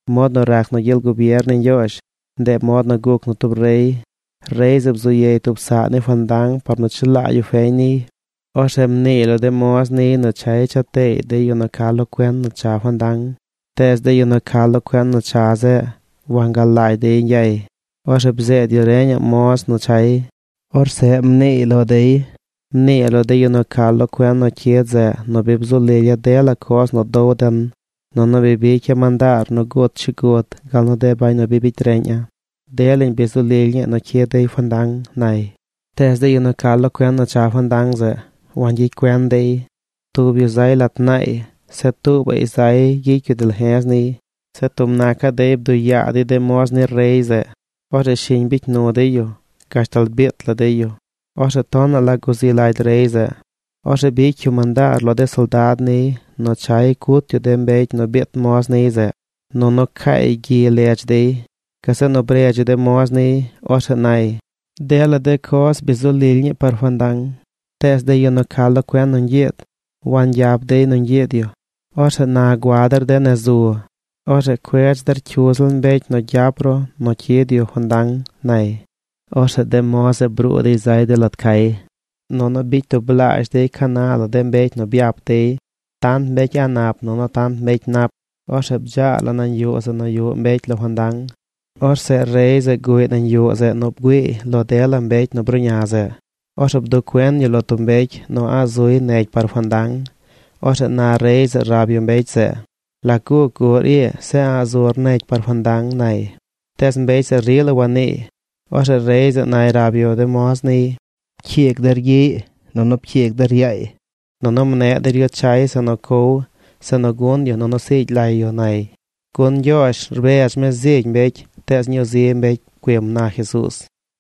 ―Mod nu rac nu gyel gubier ni Ñgyoozh, ndeꞌ mod nu guc nu tub rey. Rey zeꞌ bzu yey tub saꞌ ni fandang par nu chelaa yu feñ niy. Orzeꞌ mniiy lo de moz niy nu chay cha teey de yu nu ca lo cuen nu cha fandang. Tees de yu nu ca lo cuen nu cha zeꞌ, wangalagy dey ñgyay. Orzeꞌ bzeed yu reñaꞌ moz nu chay. Orzeꞌ mniiy lo dey: “Mnii lo de yu nu ca lo cuen nu cyid zeꞌ nu bi bzu lilya̱ dela coz nu dow den. Nunu bi bicya̱ mandaar nu gut chigud gal nu de bañ nu bi bicy reꞌña̱. Delañ bi zu lily ñii nu cyid dey fandang”, nay. Tees de yu nu ca lo cuen nu cha fandang zeꞌ, wangyicy cuen dey. Tub yu zay lat naay. Zeꞌ tuubaꞌy zay gyicy yu dalje̱z niy. Zeꞌ tub nacaꞌ dey bduꞌ yaa dey de moz ni rey zeꞌ. Orzeꞌ shiñ bicy nu dey yu gashtal biit la dey yu. Orzeꞌ tonaꞌ la guzi lagy rey zeꞌ. Orzeꞌ bicy yu mandaar lo de soldad niy nu chay cut yu de mbecy nu biit moz niy zeꞌ, nunu caay gyi ledz dey. Gazeꞌ nu bredz yu de moz niy. Orzeꞌ nay: “Dela de coz bi zu lily ñii par fandang, tees de yu nu ca lo cuen nu ñgyiid, wangyap dey nu ñgyiid yu. Orzeꞌ na gua der de nez zu. Orzeꞌ cuedz der cyu ziꞌl mbecy nu gyap ru nu cyid yu fandang”, nay. Orzeꞌ de moz zeꞌ bruu dey zay de lat cay. Nunu bicy tublaazh dey ca na la de mbecy nu byap dey: tant mbecy a̱ꞌ nap nunu tant mbecy nap. Orzeꞌ bdzaa la nañ yuꞌ zeꞌ nu yuꞌ mbecy lo fandang. ’Orzeꞌ rey zeꞌ guꞌy nañ yuꞌ zeꞌ nu bgüiiy lo dela mbecy nu bruꞌña zeꞌ. Orzeꞌ bduꞌ cuen yu lo tub mbecy nu a̱ꞌ zuy negy par fandang. Orzeꞌ na rey zeꞌ rab yu mbecy zeꞌ: “¿Lac guc guꞌr ii zeꞌ a̱ꞌ zur negy par fandang?” nay. Tees mbecy zeꞌ rila waniiy. Orzeꞌ rey zeꞌ nay rab yu de moz niy: “Pcyiigy der gyiꞌy nunu pcyiig der yaay. Nunu mneꞌ der yu chay zeꞌ nu cow, zeꞌ nu gun yu nunu siigy lay yu”, nay. Gun Ñgyoozh rbedz mi zigy mbecy tees ñuu zi mbecy pcuim ―na Jesuuz.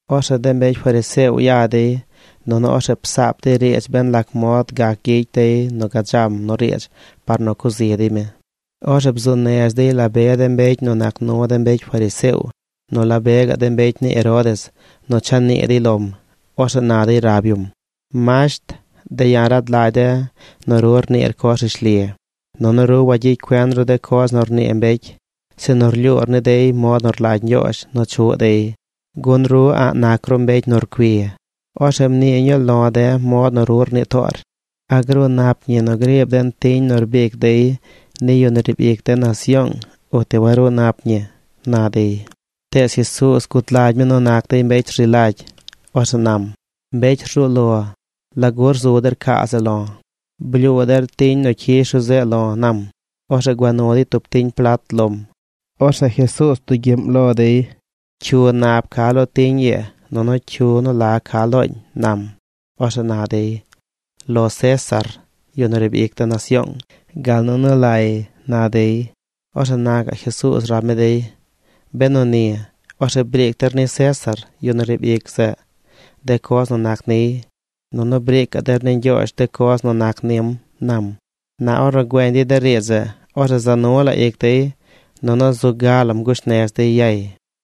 Orzeꞌ de mbecy fariseo ya dey, nunu orzeꞌ psaap dey riidz ben lac mod gac gyicy dey nu gadzam nu riidz par nu cuꞌ zi dey mi. Orzeꞌ bzuu nez dey la be de mbecy nu nac nu de mbecy fariseo nu la be gaꞌ de mbecy ni Herodes nu cha nii dey lom. Orzeꞌ na dey rab yum: ―Masht, de̱ ya̱ rad lagy de̱ nu ru rniir coz rishli. Nunu ru wagyicy cuen ru de coz nu rnii mbecy, sinu rlyuur ni dey mod nu rlagy Ñgyoozh nu chuꞌ dey, gun ru a̱ꞌ nac ru mbecy nu rcui. Orzeꞌ mnii ñuu lo̱ de̱ mod nu ru rnii toor. ¿A gruu nap ñi nu griib den tiñ nu rbic dey ni yu nu riib ic de nasyoong, uti waruu nap ñi? ―na dey. Tees Jesuuz gud lagy mi nu nac dey mbecy rzi lagy. Orzeꞌ nam: ―Mbecy rzuu lo, ¿lagu rzu der caa zeꞌ lo̱? Blyuu der tiñ nu cyish ru zeꞌ lo̱ ―nam. Orzeꞌ gua nu dey tub tiñ plat lom. Orzeꞌ Jesuuz bdugyiꞌm lo dey: ―¿Cyu nab ca lo tiñ ii nunu cyu nu la ca looñ? ―nam. Orzeꞌ na dey: ―Lo César, yu nu riib ic de nasyoong, gal nu nu lay ―na dey. Orzeꞌ na gaꞌ Jesuuz rab mi dey: ―Benu ni, orzeꞌ briic der ni César, yu nu riib ic zeꞌ, de coz nu nac niy, nunu briicaꞌ der ni Ñgyoozh de coz nu nac nim ―nam. Na ornu güeñ dey de riidz zeꞌ, orzeꞌ za nu la ic dey nunu zu ga lam gush nez dey yay.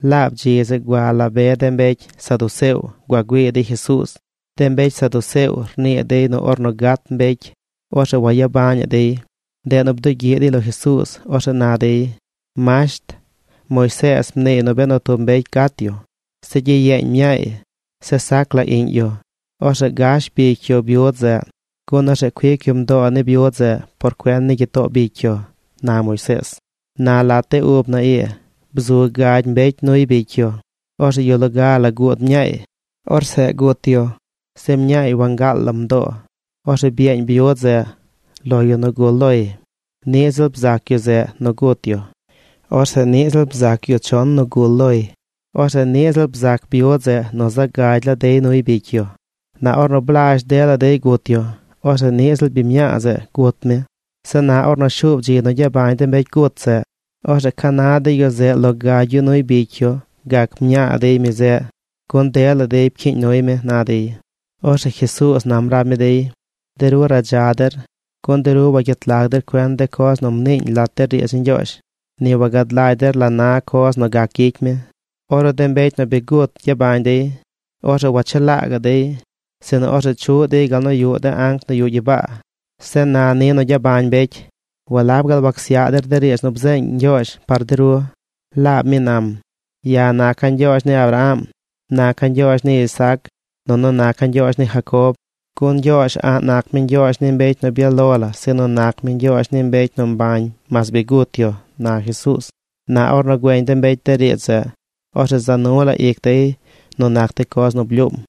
Laab dzi zeꞌ gua la be de mbecy saduceo gua güii dey Jesuuz. De mbecy saduceo rnii dey nu ornu gat mbecy, orzeꞌ wagyabañaꞌ dey. Ndeꞌ nu bdugyiꞌ dey lo Jesuuz. Orzeꞌ na dey. ―Masht, Moisees mniiy nu benu tub mbecy gat yu, zeꞌ gyiyeeñ mñaay, zeꞌ sac la iꞌñ yu, orzeꞌ gash bicy yu byud zeꞌ, gun orzeꞌ cuic yu mdoo ni byud zeꞌ por cuen ni gyitoo bicy yu, na Moisees. Na lat de ub na ii bzu gagy mbecy nuy bicy yu. Orzeꞌ yu loga guud mñaay. Orzeꞌ gut yu. Zeꞌ mñaay wangaal lam mdoo. Orzeꞌ byeeñ byud zeꞌ lo yu nu gul loy. Niꞌ ziꞌl bzac yu zeꞌ nu gut yu. Orzeꞌ niꞌ ziꞌl bzac yu chon nu gul loy. Orzeꞌ niꞌ ziꞌl bzac byud zeꞌ nu zaꞌ gagy la dey nuy bicy yu. Na ornu blazh dela dey gut yu, orzeꞌ niꞌ ziꞌl biñ mñaa zeꞌ gut mi. Zeꞌ na ornu shuub dzi nu gyabañ de mbecy gut zeꞌ, orzeꞌ ¿ca na de yu zeꞌ lo gagy yu nuy bicy yu gac mñaa dey mi zeꞌ? Gun dela dey pcyiiñ nuy mi ―na dey. Orzeꞌ Jesuuz nam rab mi dey: ―De ru radza der, gun de ru wagyet lag der cuen de coz nu mniiñ lat de riidz ni Ñgyoozh. Ni wagad lagy der la na coz nu gac gyicy mi. Ornu de mbecy nu bi gut gyabañ dey, orzeꞌ wachelaa gaꞌ dey, sinu orzeꞌ chuꞌ dey gal nu yuꞌ de anc nu yuꞌ gyibaa. Zeꞌ na ni nu gyabañ mbecy, ¿walab gaal wacsyaꞌ der de riidz nu bzeeñ Ñgyoozh par de ru? Laab mi nam: “Ya̱ naca̱ Ñgyoozh ni Abraham, naca̱ Ñgyoozh ni Isaac, nunu naca̱ Ñgyoozh ni Jacob.” ¡Gun Ñgyoozh a̱ꞌ nac mi Ñgyoozh ni mbecy nu byaꞌ lo la sinu nac mi Ñgyoozh ni mbecy nu mbañ mas bi gut yu! ―na Jesuuz. Na ornu güeñ de mbecy de riidz zeꞌ, orzeꞌ za nu la ic dey nu nac de coz nu blyuum.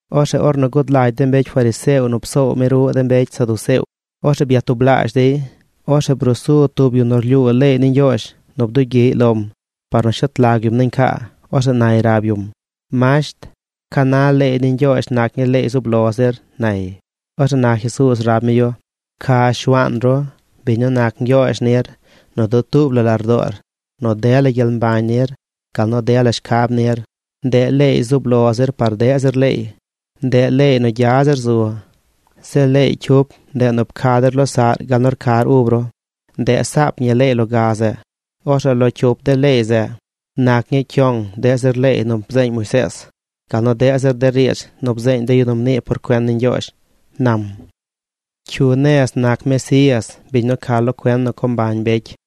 Orzeꞌ ornu gud lagy de mbecy fariseo nu psoow mi ruꞌ de mbecy saduceo, orzeꞌ byatublaazh dey. Orzeꞌ bruu su tub yu nu rlyuu leey ni Ñgyoozh nu bdugyiꞌy lom par nu shet lag yum nañ caa. Orzeꞌ nay rab yum: ―Masht, ¿ca na leey ni Ñgyoozh nac ñii leey zub lo zir? ―nay. Orzeꞌ na Jesuuz rab mi yu: ―“Pca Shuaan ru, biñ nu nac Ñgyoozh nir, nu dutuub la lardoor, nu dela gyel mbañ nir, gal nu nu dela shcab nir.” Ndeꞌ leey zub lo zir par deꞌ zir leey. Ndeꞌ leey nu gya zir zu. Zeꞌ leey cyup, ndeꞌ nu “Pca der losaꞌr gal nu rcar ub ru.” Ndeꞌ saap ñi leey loga zeꞌ. Orzeꞌ lo cyup de leey zeꞌ nac ñi cyong deꞌ zir leey nu bzeeñ Moisees, gal nu deꞌ zir de riidz nu bzeeñ de yu nu mnii por cuen ni Ñgyoozh ―nam. ¿Cyu nez nac Mesías, biñ nu ca lo cuen nu co mbañ mbecy?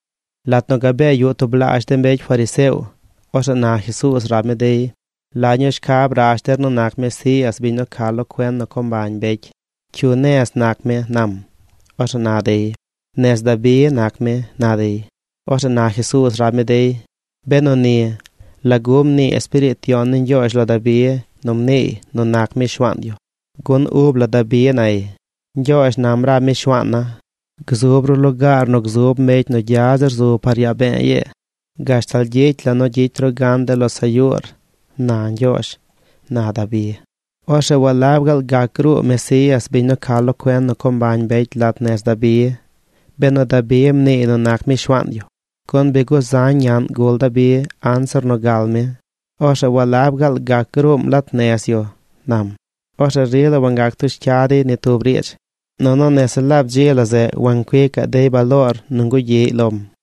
Lat nu gabee yuꞌ tublaazh de mbecy fariseo, orzeꞌ na Jesuuz rab mi dey: ―¿La ñuu shcab rash der nu nac Mesías, biñ nu ca lo cuen nu co mbañ mbecy? ¿Cyu nez nac mi? ―nam. Orzeꞌ na dey: ―Nez Dabi nac mi ―na dey. Orzeꞌ na Jesuuz rab mi dey: ―Benu ni, ¿lagu mnii Espiriit Yon ni Ñgyoozh lo Dabi nu mniiy nu nac mi Shuaan yu? Gun ub la Dabi nay: Ñgyoozh nam rab mi Shuaana̱: “Gzub ru lugaar nu gzub mbecy nu gya zir zu par yaa be̱e̱ ii, gashtal gyicy la̱ nu gyicy ru gan de losaꞌr yuur”, na Ñgyoozh, na Dabi. ’Orzeꞌ ¿walab gaal gac gruu Mesías, biñ nu ca lo cuen nu co mbañ mbecy lat nez Dabi, benu Dabi mniiy nu nac mi Shuaan yu? Gun bi guzañ naꞌñ gul Dabi anzir nu gal mi. Orzeꞌ ¿walab gaal gac gruum lat nez yu? ―nam. Orzeꞌ rila wangac tush cya dey ni tub riidz. Nunu nese laab dzi la zeꞌ wancuicaꞌ dey baloor nu ngugyiꞌy lom.